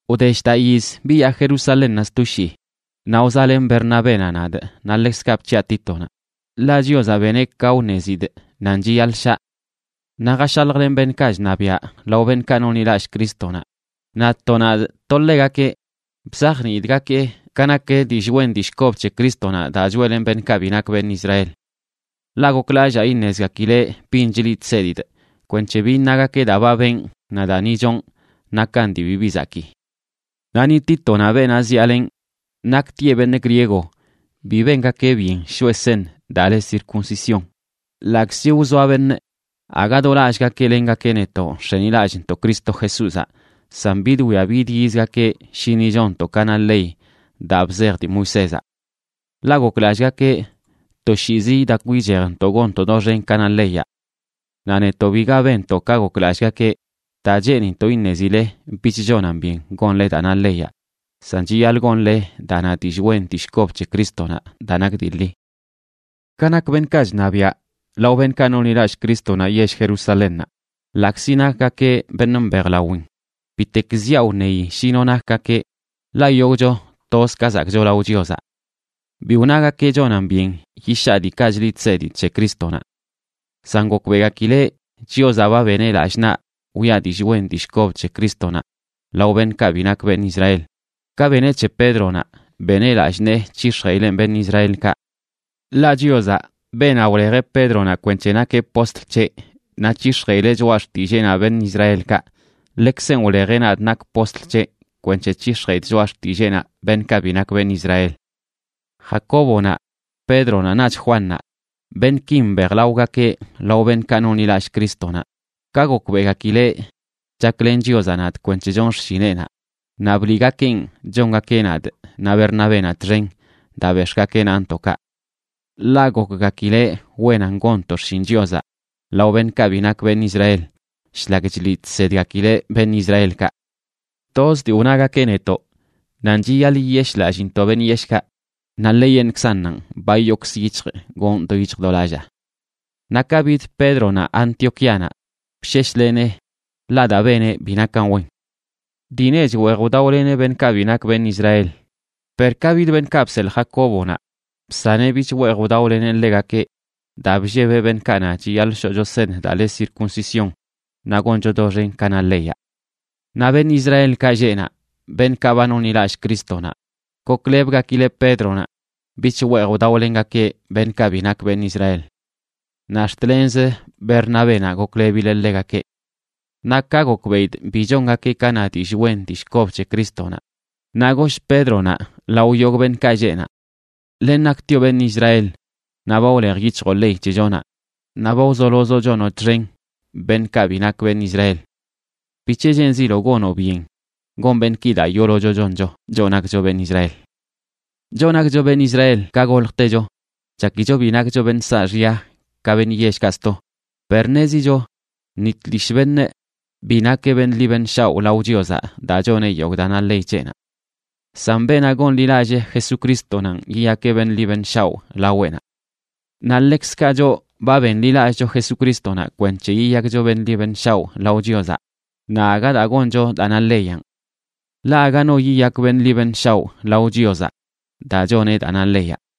Wde shdaꞌ yiz biyaa Jerusalénnaꞌ sto shii, naꞌ wzaꞌlen Bernabénaꞌ nadꞌ naꞌ ḻekzkaꞌ bc̱hiꞌa Títonaꞌ, ḻaꞌ Chiozaꞌ beneꞌ ka wṉezidꞌ nan chiyaḻꞌ shaꞌ. Naꞌ jashaljlenꞌ beṉꞌkaꞌ chṉabiaꞌ lao beṉꞌkaꞌ nonḻilallꞌ Crístonaꞌ, naꞌ to nadꞌ to ḻegakeꞌ bzajniidꞌgakeꞌ ka nak dillꞌ wen dillꞌ kob c̱he Crístonaꞌ daa choeꞌlenꞌ beṉꞌkaꞌ bi nak beṉꞌ Israel. Ḻaꞌ goklallaa iṉezgakileꞌ bin chliꞌ chsedidꞌ kwenc̱he bi iṉagakeꞌ daa ba benꞌ naꞌ daa ni chonꞌ nakan dii bibi zakii. Naꞌ ni Títonaꞌ, beenaꞌ zyaalenꞌ, naktieꞌ beṉꞌ griego, bi bengakeꞌ byen shoꞌe seṉ daa le circuncisión, ḻaꞌkzi wzoa beṉꞌ aga do lallꞌgakeꞌ lengakeꞌ netoꞌ nx̱enilallꞌntoꞌ Cristo Jesúzaꞌ san bidwia bidyizgakeꞌ shi ni chonntoꞌ ka na ley daa bzej dii Moisézaꞌ. Ḻaꞌ goklallꞌgakeꞌ toshiizi idakw ichejntoꞌ gonntoꞌ doxen ka na leyaꞌ. Naꞌ netoꞌ, biga benntoꞌ ka goklallꞌgakeꞌ, daa cheenintoꞌ iṉezile bich chonan byen gonle daa na leyaꞌ, san chiyaḻꞌ gonle daa na dillꞌ wen dillꞌ kob c̱he Crístonaꞌ daa nak dii ḻi. Ka nak beṉꞌkaꞌ chṉabiaꞌ lao beṉꞌkaꞌ nonḻilallꞌ Crístonaꞌ yell Jerusalénnaꞌ, ḻaꞌkzi nakgakeꞌ beṉꞌ mbejlawin bitek ziaꞌ wṉeyi shi no nakgakeꞌ, ḻaꞌ yogꞌcho toz ka zakꞌcho lao Chiozaꞌ. Bi wnagakeꞌ chonan byen yishaa diikaꞌ chliꞌ chsedidꞌ c̱he Crístonaꞌ. San gokbeꞌgakileꞌ Chiozaꞌ ba beneꞌ lallꞌ naꞌ wiꞌa dillꞌ wen dillꞌ kob c̱he Crístonaꞌ lao beṉꞌkaꞌ bi nak beṉꞌ Israel, ka beneꞌ c̱he Pédronaꞌ beneꞌ lallꞌ nee c̱hix̱jeꞌileꞌn beṉꞌ Israelkaꞌ. Ḻaꞌ Chiozaꞌ, beenaꞌ wlejeꞌ Pédronaꞌ kwenc̱he nakeꞌ postl c̱heꞌ naꞌ c̱hix̱jeꞌileꞌ choꞌa xtilleenaꞌ beṉꞌ Israelkaꞌ, ḻekzenꞌ wlejeꞌ nadꞌ nakꞌ postl c̱heꞌ kwenc̱he c̱hix̱jeꞌidꞌ choꞌa xtilleenaꞌ beṉꞌkaꞌ bi nak beṉꞌ Israel. Jacóbonaꞌ, Pédronaꞌ, naꞌch Juannaꞌ, beṉꞌkin mbejlaogakeꞌ lao beṉꞌkaꞌ nonḻilallꞌ Crístonaꞌ, ka gokbeꞌgakileꞌ chaklen Chiozaꞌ nadꞌ kwenc̱he chonꞌ xshineꞌnaꞌ, naꞌ bliꞌgakeꞌn chongakeꞌ nadꞌ naꞌ Bernabénaꞌ txen daa bex̱ꞌgakeꞌ naꞌntoꞌkaꞌ. Ḻaꞌ gokgakileꞌ wenan gonntoꞌ xshin Chiozaꞌ lao beṉꞌkaꞌ bi nak beṉꞌ Israel shlak chliꞌ chsedgakileꞌ beṉꞌ Israelkaꞌ. Toz dii wnagakeꞌ netoꞌ nan chiyaḻꞌ yiyeshꞌlallintoꞌ beṉꞌ yeshꞌkaꞌ, naꞌ ḻeyeṉꞌkzannanꞌ ba yookzə yic̱hjꞌ gonꞌ do yic̱hj do lallaa. Naꞌ ka bid Pédronaꞌ Antioquíanaꞌ, bsheshlenee, ḻaꞌ daa beneꞌ bi nakan wen. Dii nech weej wdaoleneꞌ beṉꞌkaꞌ bi nak beṉꞌ Israel, per ka bid beṉꞌkaꞌ bseḻꞌ Jacóbonaꞌ, bsaneꞌ bich weej wdaoleneꞌ ḻegakeꞌ daa bllebeꞌ beṉꞌkaꞌ na chiyaḻꞌ shoꞌcho seṉ daa le circuncisión naꞌ goncho doxen ka na leyaꞌ. Naꞌ beṉꞌ Israelkaꞌ lleꞌ naꞌ, beṉꞌkaꞌ ba nonḻilallꞌ Crístonaꞌ goklebgakileꞌ Pédronaꞌ bich weej wdaolengakeꞌ beṉꞌkaꞌ bi nak beṉꞌ Israel. Naꞌ ax̱t lenzə Bernabénaꞌ goklebileꞌ ḻegakeꞌ. Naꞌ ka gokbeꞌidꞌ bi chongakeꞌ ka na dillꞌ wen dillꞌ kob c̱he Crístonaꞌ, naꞌ goshꞌ Pédronaꞌ lao yogꞌ beṉꞌkaꞌ lleꞌ naꞌ: “Len naktioꞌ beṉꞌ Israel, naꞌ ba wlej yic̱hjoꞌ ley c̱hechonaꞌ naꞌ ba wzolozoꞌ chonoꞌ txen beṉꞌkaꞌ bi nak beṉꞌ Israel. ¿Bic̱he cheenziloꞌ gonoꞌ byen gon beṉꞌki daa yoolocho choncho, choꞌ nakcho beṉꞌ Israel?” Choꞌ nakcho beṉꞌ Israel ka goljtecho chakicho bi nakcho beṉꞌ saaxya ka beṉꞌ yellkaꞌ sto, per ṉezicho ni tlishꞌ beṉꞌ bi nakeꞌ beṉꞌ ḻi beṉꞌ shaoꞌ lao Chiozaꞌ daa choneꞌ yogꞌ daa na ley c̱heꞌnaꞌ. San beenaꞌ gonḻilallee Jesucristonanꞌ yiyakeꞌ beṉꞌ ḻi beṉꞌ shaoꞌ laweꞌnaꞌ. Naꞌ ḻekzkaꞌ choꞌ ba benḻilallꞌcho Jesucrístonaꞌ kwenc̱he yiyakcho beṉꞌ ḻi beṉꞌ shaoꞌ lao Chiozaꞌ, naꞌ aga daa goncho daa na leyanꞌ. Ḻaꞌ aga no yiyak beṉꞌ ḻi beṉꞌ shaoꞌ lao Chiozaꞌ daa choneꞌ daa na leyaꞌ.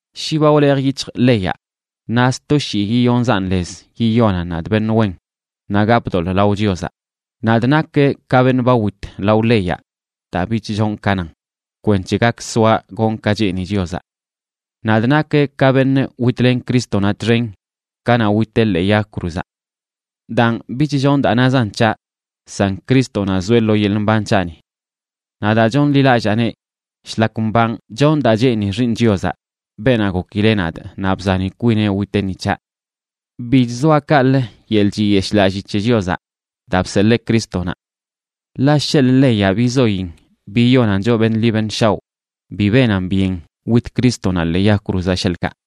Shi ba wlej yic̱hjꞌ leyaꞌ, naꞌ sto shii yiyonzaꞌn lez yiyonan nadꞌ beṉꞌ wen, naꞌ gapꞌ doḻꞌ lao Chiozaꞌ. Nadꞌ nakꞌ ka beṉꞌ ba wit lao leyaꞌ daa bich chonꞌ ka nan, kwenc̱he gak soaꞌ gonꞌ ka cheeni Chiozaꞌ. Nadꞌ nakꞌ ka beṉꞌ witlen Crístonaꞌ txen kanaꞌ witeꞌ ḻee yag cruzaꞌ. Daan, bich chonꞌ daa nazan c̱haꞌ san Crístonaꞌ zoeꞌ lo yeḻꞌ mban c̱haꞌni. Naꞌ daa chonḻilallaaneꞌ, shlak mbanꞌ chonꞌ daa cheeni Xiiṉ Chiozaꞌ, beenaꞌ gokileꞌ nadꞌ naꞌ bzani kwineꞌ witeꞌ ni c̱haꞌ. Bi chzoaꞌ kaꞌlə yeḻꞌ chiyeshꞌlalli c̱he Chiozaꞌ daa bseḻee Crístonaꞌ. Ḻaꞌ sheḻꞌ leyaꞌ bizoyin biyonan choꞌ beṉꞌ ḻi beṉꞌ shaoꞌ, bi benan byen wit Crístonaꞌ ḻee yag cruzaꞌ, sheḻꞌkaꞌ.